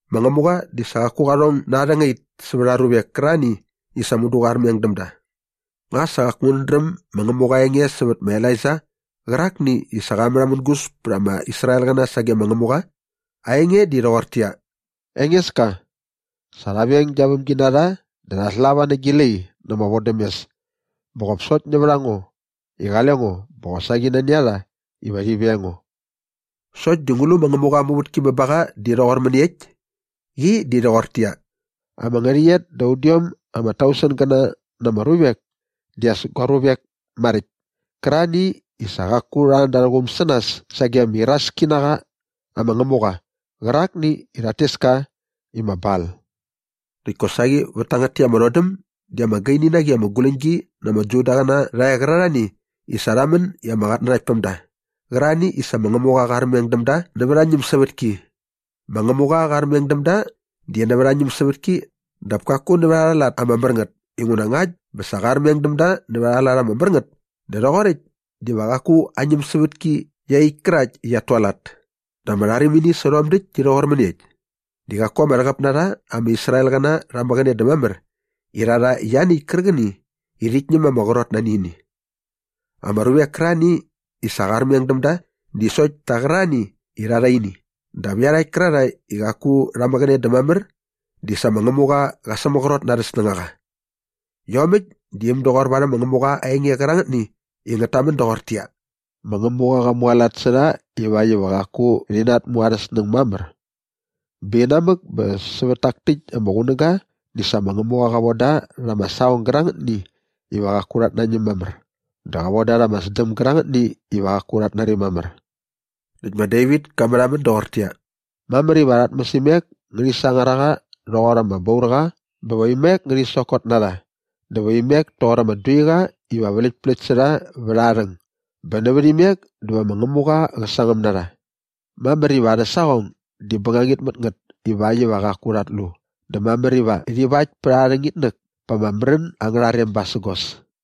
Ma Ngämuqa di sa qaku qa rhong na aa rhängait sävät aa ruvek kärarhani i sa mudu qa armeng däm da. Nga sa qaku ngänät dräm ma Ngämuqa aa enge sävät ma Elaija qärakni i sa qa märhamängus pät ama Israelqäna sage ma Ngämuqa? Aa enge di rhoqortäqyia, “Engeska, sa rha veng gia vämginarha dä rha slava nä gi lai na ama vodämes bä qop sokt nävät a ngo i qale ngo bä qosaqi nani a rha iva rhi veng ngo.” Sokt di ngu lu ma Ngämuqa aa muvätki bä ba qa di rhoqor mäniekt? Qi di rhoqortäqyia, “Ama ngärhäqyet da udiom ama tausengäna na ama ruvek di as gua ruvek maräkt kärarhani i sa qaku rha an da arhä quum sä nas sage ama iraski na qa ama ngämuqa qärakni i rhat tes ka i ma Bal.” Näkt kosaqi vät tangät täkt ama rhodäm di ama gaini na qi ama guläñgi na ama Judaqäna rha e qärarhani i sa rha män i ama qatnanaktpämda qärarhani i sa ma Ngämuqa qa armeng däm da nävät aa ñämsävätki. Ma Ngämuqa qa armeng däm da di nävät aa ñämsävätki dap kaku nävät arha lat ama mär ngät inguna ngakt bä sa qa armeng däm da nävät arha lat ama mär ngät dä rhoqoräkt diva qaku aa ñämsävätki iaqyäkt kärakt i qiat tualat. Dä ama rharimini sä rhom däkt di rhoqor mäniekt? Sokt di qaku ama rhäqäp na rha ama Israelqäna rha mäqäne dä mamär i rha rha ianiäkt kärqäni i rhit ñäm ma ama qrot nani ini. Ama ruvek kärarhani i sa qa armeng däm da di sokt ta qärarhani i rha rha ini dap iarhakt kärarhae i qaku rha mäqäne dä mamär di sa ma Ngämuqa qa sämaqrot na arhä snängaqa. Iomäkt di äm doqor varhäm ma Ngämuqa aa enge qärangätni i ngät tamän doqortäqyia, “Ma Ngämuqa qa mualat sä rha ivakt iva qaku rhi natmuarhäsnäng mamär. Bä inamäk bä sävät tak täkt ama qunäga di sa ma Ngämuqa qa von da rha ama saqong gärangätni iva qaku rhat nañäm mamär dä qa von da rha ama sdäm gärangätni iva qaku rhat nari mamär.” Näkt ma Devit ka märhamän doqortäqyia, “Mamär iva arhä tmäsimek ngärhi sangar a rha rhoqor ama baurqa bä va imek ngärhi sokot na rha dä va imek toqor ama duiqa iva vläktpläkt sä rha vät aa rhäng bä nävät imek dä va ma Ngämuqa qä sangäm na rha. Mamär iva arhä saqong di bängangit mät ngät ivakt iva qaku rhat lu dä mamär iva rhi vakt pät arha rhängitnäk pa ama märän angärha rem basägos.”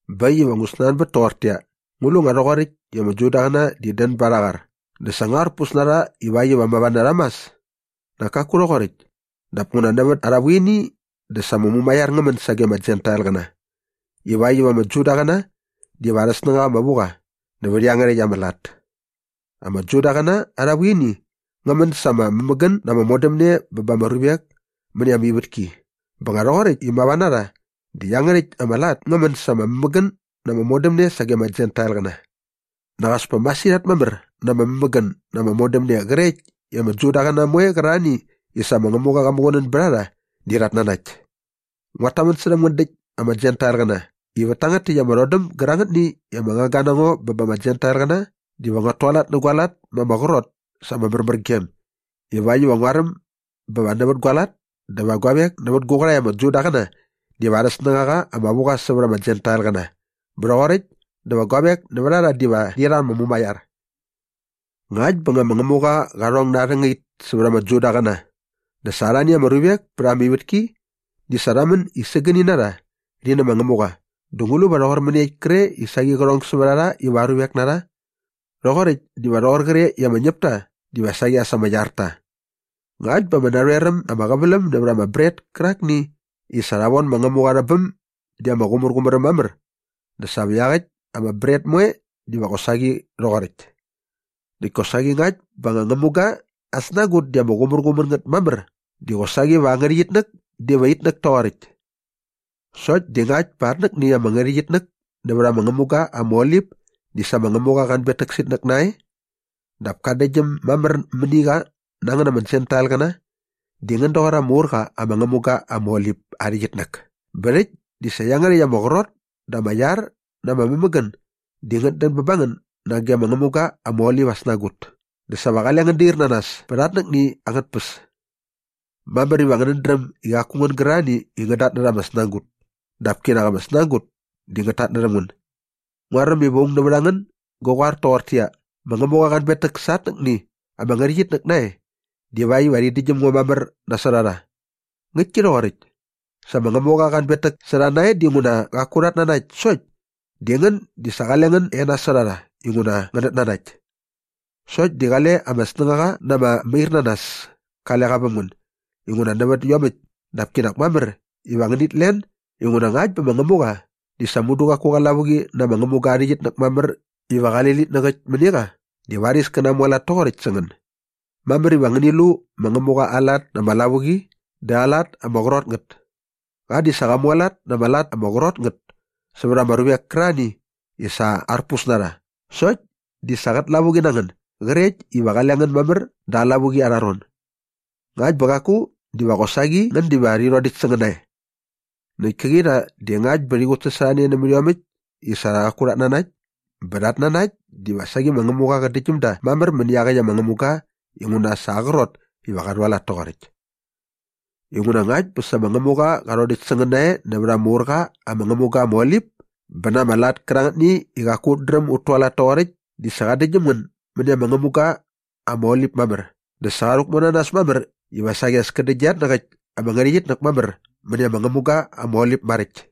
Bä äkt iva ngu snanbät toqortäqyia, ngu lu i nga rhoqoräkt i ama Judaqäna di dän ba arha qar dä sa nga arpus na rha ivakt iva sa mava na rha mas? Nak kaku rhoqoräkt! Dap nguna nävät arha vuini dä sa ama mumaiar ngä män sage ama Jentailqäna ivakt iva ama Judaqäna diva arhä snängaqa ama vu qa nävät iangärhäkt ama lat. Ama Judaqäna arha vuini ngä män sa ama mämägän na ama modämne bä ba ama ruvek mäni ama ivätki bä nga rhoqoräkt i mava na rha di iangärhäkt ama lat ngä män sa ama mämägän na ama modämne sage ama Jentailqäna. Nak as pa masirhat mamär na ama mämägän na ama modämne qrekt i ama Judaqäna moe qärarhani i sa ma Ngämuqa qa muqunän bät a rha di rhat nanakt. Nguat tamän särhäm ngän däkt ama Jentailqäna i vät tangät täkt ama rhodäm gärangätni i ama ngangga na ngo bä ba ama Jentailqäna diva nguat tualat nä gua lat ma ama qrot sa ama märmärgem ivakt iva nguaräm bä va nävät gua lat dä va guavek nävät gu qärhae ama Judaqäna diva arhä snängaqa ama vu qa sävät ama Jentailqäna bä rhoqoräkt dä va guavek nävät a rha diva rhi rha ama mumaiar. Ngäkt bä nga ma Ngämuqa qa rhong na aa rhängait sävät ama Judaqäna dä sa arhani ama ruvek pät ama ivätki di sa rha män i sägäni na rha rhi nä ma Ngämuqa dä ngu lu va rhoqor mäniekt kre i saqi qä rhong sävät a rha iva aa ruvek na rha? Rhoqoräkt diva rhoqor qre i ama ñäpta diva saqi as ama iar ta. Ngakt bä ama narhoer äm ama qäväläm nävät ama bret kärakni i sa rha von ma Ngämuqa rhä bäm di ama qumärqumär äm mamär dä sa va iaqäkt ama bret moe diva qosaqi rhoqoräkt. Näkt kosaqi ngakt bä anga ngämuga aa snagut di ama qumärqumär ngät mamär di qosaqi va aa ngärhäqyitnäk diva itnäk toqoräkt. Sokt di ngakt bä atnäkni ama ngärhäqyitnäk nävät ama ngämuga ama olip di sa ma Ngämuqa qa anbetäk sä itnäk nae dap ka däktgyäm mamär mäni qa na ngän ama Jentailqäna di ngän doqor ama ur qa ama ngämuga ama olip aa ngärhäqyit bä rhäkt di sa iangärhäkt ama qrot dä ama iar na ama mämägän di ngät dän bä ba ngän nage ama ngämuga ama olip aa snagut dä sa va qale ngän dair na nas pät iatnäqäkt angät tpäs. Mamär iva ngänät dräm i qaku ngän gärarhani i rhat tatnärha ama snagut dap kinak ama snagut di ngät tatnärhäm ngän. Nguaräm iva aung nävät a ngän gä qoar toqortäqyia, “Ma Ngämuqa qa anbetäk sa atnäkni ama ngärhäqyitnäk nae divakt iva rhi däktgyäm ngo mamär nasot a rha.” Ngäktki rhoqoräkt. Sa ma Ngämuqa qa anbetäk sä rha nae dinguna qaku rhat nanakt sokt di ngän di sa qale ngän e nasot a rha inguna ngänät nanakt. Sokt di qale ama snängaqa na ama mairnanas kale qa väm ngän inguna nävät iomäkt dap kinak mamär iva ngänit len inguna ngakt bä ma Ngämuqa di sa mudu qaku qa lavuqi na ama ngämuga aa ngärhäqyitnäk mamär iva qali litnäk äkt mäni qa dä varis kä namualat toqoräkt sä ngän. Mamär iva ngäni lu ma Ngämuqa aa lat na ama lavuqi dä aa lat ama qrot ngät. Qa di sa qa mualat na ama lat ama qrot ngät sävät ama ruvek kärarhani i sa arpus na rha sokt di sa qät lavuqi na ngän grekt iva qale ngän mamär da aa lavuqi arha ron. Ngakt bä qaku diva qosaqi ngän diva qä rhodäkt sä ngän nae. Näkt käqi rha di ngakt bä rhi qutsasorhane nämät iomäkt i sa qaku rhat nanakt bä rhat nanakt diva saqi ma Ngämuqa qä däktgyäm da mamär mäni iaqäkt ama ngämuga inguna sa aa qrot iva qa rhualat toqoräkt. Inguna ngakt bä sa ma Ngämuqa qa rhodäkt sä ngän nae nävät ama ur qa ama ngämuga ama olip bä na ama lat kärangätni i qaku ut dräm ut tualat toqoräkt di sa qa däktgyäm ngän mäni ama ngämuqa ama olip mamär dä sa qa rhäkmu na nas mamär iva saqi as kä däktgyä iatnäqäkt ama ngärhäqyitnäk mamär mäni arha ngämuqa ama olip maräkt.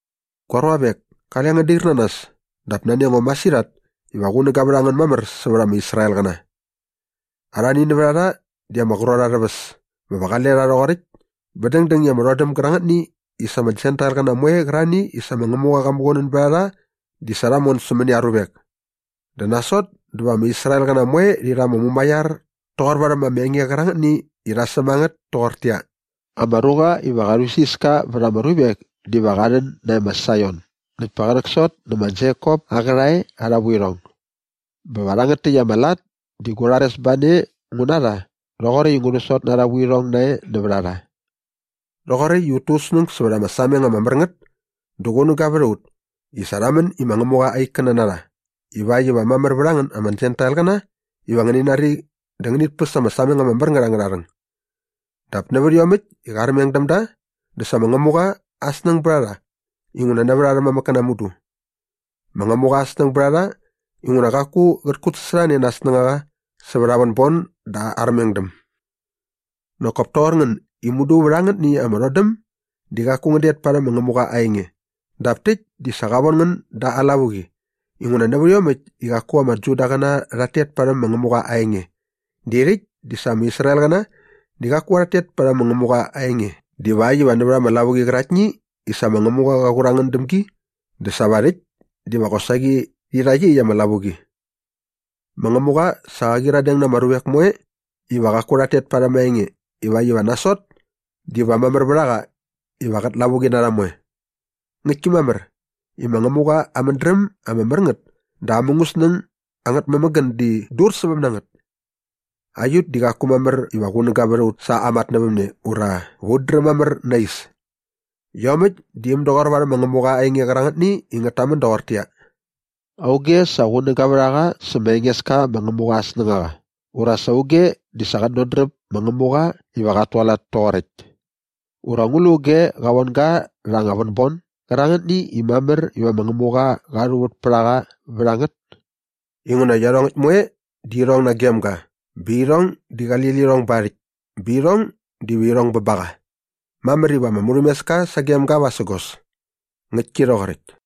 Gua ruavek, kale ngän dair na nas dap nani a ngo masirhat iva qunäga vät a ngän mamär sävät ama Israelqäna. Arhani nävät a rha di ama qrot arhä väs bä va qale rha rhoqoräkt bä dängdäng i ama rhodäm gärangätni i sa ama Jentailqäna moe qärarhani i sa ma Ngämuqa qa muqunän bät a rha di sa rha mon sämäni aa ruvek. Dä nasot dä va ama Israelqäna moe rhi rha ama mumaiar toqor varhäm ama enge qärangätni i rha säm a ngät toqortäqyia, “Ama ruqa iva qa rhuisiska vät ama ruvek diva qa rhän nae ma Saion näkt pa qä rhäksot nä ma Jekop aa qärhae arha vuirhong.” “Bä va rhangät täkt ama lat di gu rharesbane ngu na rha rhoqoräkt i ngu sot na arha vuirhong nae nävät a rha.” Rhoqoräkt i ut tu ut snäng sävät ama sameng ama mär ngät dä qunäga vät a ut i sa rha män i ma Ngämuqa aa ikkäna na rha ivakt iva mamär vät a ngän ama Jentailqäna iva ngäni nari dä ngänit päs ama sameng ama mär ngät angärha rhäng. Dap nävät iomäkt i qa armeng däm da dä sa ma Ngämuqa aa snäng bät a rha inguna nävät arhä mamäkkäna mudu. Ma Ngämuqa aa snäng bät a rha inguna qaku qät kutsasorhane na aa snängaqa sävät aa vänbon dä aa armengdäm. Nak kop toqor ngän i mudu vät angätni ama rhodäm di qaku ngän det parhäm ma Ngämuqa aa enge dap täkt di sa qa von ngän da aa lavuqi inguna nävät iomäkt i qaku ama Judaqäna rha tet parhäm ma Ngämuqa aa enge di rhäkt di sa ama Israelqäna di qaku rhat tet parhäm ma Ngämuqa aa enge divakt iva nävät ama lavuqi qäraktni i sa ma Ngämuqa qa qur a ngän däm gi dä sa va rhäkt diva qosaqi rhi rha iaqyäkt ama lavuqi. Ma Ngämuqa sa qa qyiradeng na ama ruvek moe iva qaku rhat tet parhäm aa enge ivakt iva nasot diva mamär vät a qa iva qät lavuqi na rha moe. Ngäktki mamär i ma Ngämuqa aa mädräm ama mär ngät dä aa mungäsnäng angät mämägän di dursäväm na ngät. Aiut di qaku mamär iva qunäga vät a ut sa aa matnävämne ura va ut dräm mamär na aa is. Iomäkt di äm doqor varhäm ma Ngämuqa aa enge qärangätni i ngät tamän doqortäqyia, “Auge sa qunäga vät a qa sä ma Engeska ma Ngämuqa aa snängaqa ura sa auge di sa qät dodräp ma Ngämuqa iva qat tualat toqoräkt?” “Ura ngu lu auge qa von ga rha anga vänbon gärangätni i mamär iva ma Ngämuqa qa rhuvät pät a qa vät a ngät?” Inguna iarhongäkt moe di irhong nagem ga bä irhong di qali lirhong ba aa rhäkt bä irhong diva irhong bä ba qa. Mamär iva ama murhämeska sagem ga vasägos. Ngäktki rhoqoräkt.